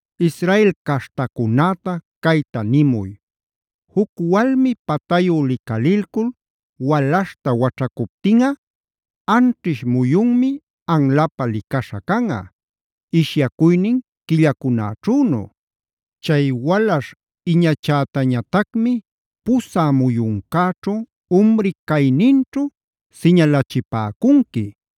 “Israel caśhtacunäta cayta nimuy: Juc walmi patayu licalilcul walaśhta waćhacuptinꞌa anćhish muyunmi anlapä licaśha canꞌa, ishyacuynin quillacunächünu. Chay walaśh iñachätañatacmi pusä muyuncäćhu umri cayninćhu siñalachipäcunqui.a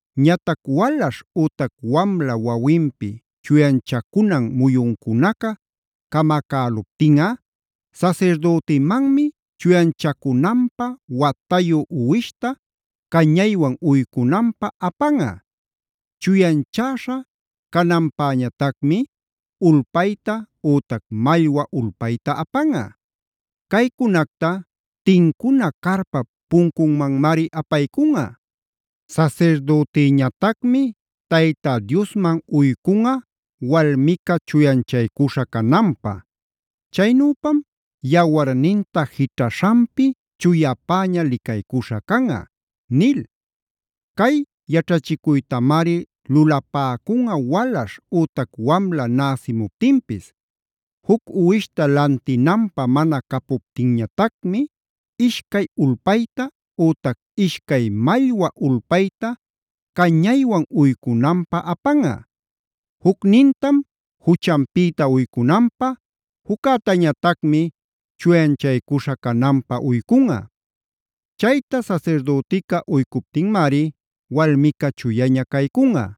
“Ñatac walaśh ütac wamla wawinpi chuyanchacunan muyuncunaca camacäluptinꞌa, sasirdütimanmi chuyanchacunanpä watayu uwishta cañaywan uycunanpä apanꞌa; chuyanchäśha cananpäñatacmi ulpayta ütac mallwa ulpayta apanꞌa. Caycunacta tincuna carpap puncunmanmari apaycunꞌa. Sasirdütiñatacmi Tayta Diosman uycunꞌa walmica chuyanchaycuśha cananpä. Chaynüpam yawarninta jićhaśhanpi chuyapäña licaycuśha canꞌa” nil. Cay yaćhachicuytamari lulapäcunꞌa walaśh ütac wamla näsimuptinpis. Juc uwishta lantinanpä mana capuptinñatacmi ishcay ulpayta ütac ishcay mallwa ulpaytab cañaywan uycunanpä apanꞌa. Jucnintam juchanpïta uycunanpä; juccätañatacmi chuyanchaycuśha cananpä uycunꞌa. Chayta sasirdütica uycuptinmari walmica chuyaña caycunꞌa.